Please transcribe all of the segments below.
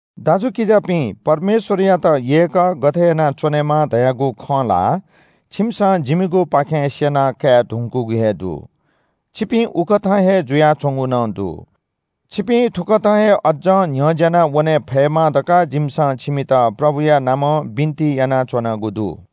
दाजुकिजापिं, परमेश्‍वरयात यय्‌क गथे यानाच्‍वनेमाः धयागु खँ ला छिमिसं जिमिगुपाखें स्‍यना काये धुंकूगु हे दु। छिपिं उकथं हे जुयाच्‍वंगु नं दु। छिपिं थुकथं हे अज्‍जं न्‍ह्यज्‍यानावने फयेमा धकाः जिमिसं छिमित प्रभुया नामं बिन्‍ति यानाच्‍वनागु दु।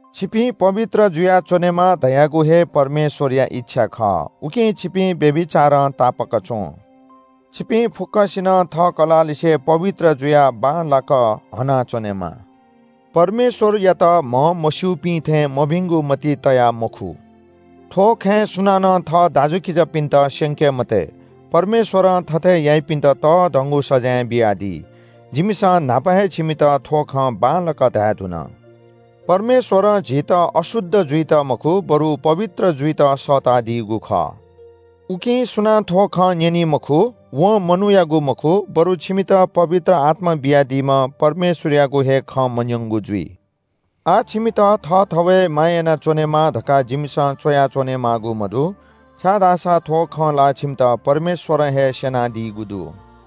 छिपिं पवित्र जुयाच्‍वनेमा धयागु हे परमेश्‍वरया इच्‍छा खः, उकिं छिपिं व्‍यभिचारं तापाक च्‍वँ। छिपिं फुक्‍कसिनं थः कलाःलिसे पवित्र जुयाः बांलाक हना च्‍वनेमाः। परमेश्‍वरयात म्‍हमस्‍यूपिं थें मभिंगु मतिइ तयाः मखु। थ्‍व खँय् सुनानं थः दाजुकिजापिन्‍त स्‍यंके मते। परमेश्‍वरं थथे याइपिन्‍त तःधंगु सजाँय बियादी। जिमिसं न्‍हापा हे छिमित थ्‍व खँ बांलाक धायेधुन। परमेश्‍वरं झीत अशुद्ध जुइत मखु, बरु पवित्र जुइत सःतादीगु खः। उकिं सुनां थ्‍व खँ न्‍यनी मखु वं मनूयागु मखु, बरु छिमित पवित्र आत्‍मा बियादीम्‍ह परमेश्‍वरयागु हे खँ मन्‍यंगु जुइ। आः छिमित थःथवय् माया यानाच्‍वनेमाः धकाः जिमिसं च्‍वया च्‍वनेमाःगु मदु, छाय्‌धाःसा थ्‍व खँ ला छिमित परमेश्‍वरं हे स्‍यनादीगु दु।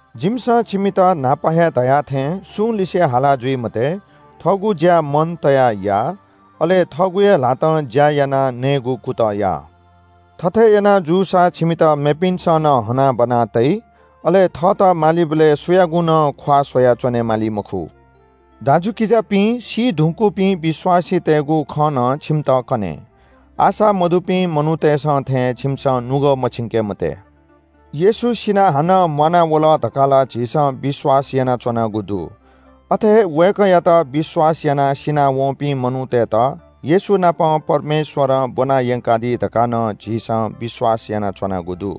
जिमिसं छिमित न्‍हापा हे धया थें सुं लिसे हाला जुइ मते, थःगु ज्‍या मन तयाः या, अले थःगु हे ल्‍हातं ज्‍या यानाः नयेगु कुतः या। थथे याना जूसा छिमित मेपिन्‍सं नं हनाबना तइ। अले थःत मालीबलय् सुयागु नं ख्‍वाः स्‍वयाच्‍वने माली मखु। दाजुकिजापिं, सी धुंकूपिं विश्‍वासीतय्‌गु खँ नं छिमित कने। आशा मदुपिं मनूतय्‌सं थें छिमिसं नुगः मछिंके मते। येशू सिनाः हानं म्‍वानावल धकाः ला झीसं विश्‍वास यानाच्‍वनागु दु। अथे हे वय्‌कःयात विश्‍वास यानाः सिनावंपिं मनूतय्‌त येशू नाप परमेश्‍वरं ब्‍वना यंकादी धकाः नं झीसं विश्‍वास यानाच्‍वनागु दु।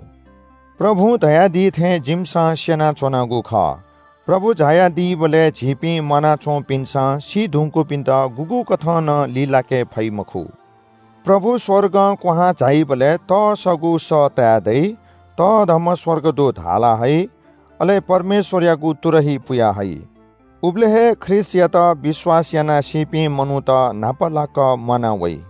प्रभुं धयादी थें जिमिसं स्‍यनाच्‍वनागु खः। प्रभु झायादीबलय् झीपिं म्‍वानाच्‍वंपिन्‍सं सी धुंकूपिन्‍त गुगुं कथं नं लिलाके फइ मखु। प्रभु स्‍वर्गं क्‍वहां झाइबलय् तस्‍सःगु सः ताये दइ, तःधंम्‍ह स्‍वर्गदूत हाला हइ, अले परमेश्‍वरयागु तुरही पुया हइ। उबलय् हे ख्रीष्‍टयात विश्‍वास यानाः सीपिं मनूत न्‍हापालाक म्‍वाना वइ।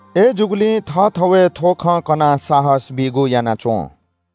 अय्‌जूगुलिं थःथवय् थ्‍व खँ कनाः साहस बीगु याना च्‍वँ।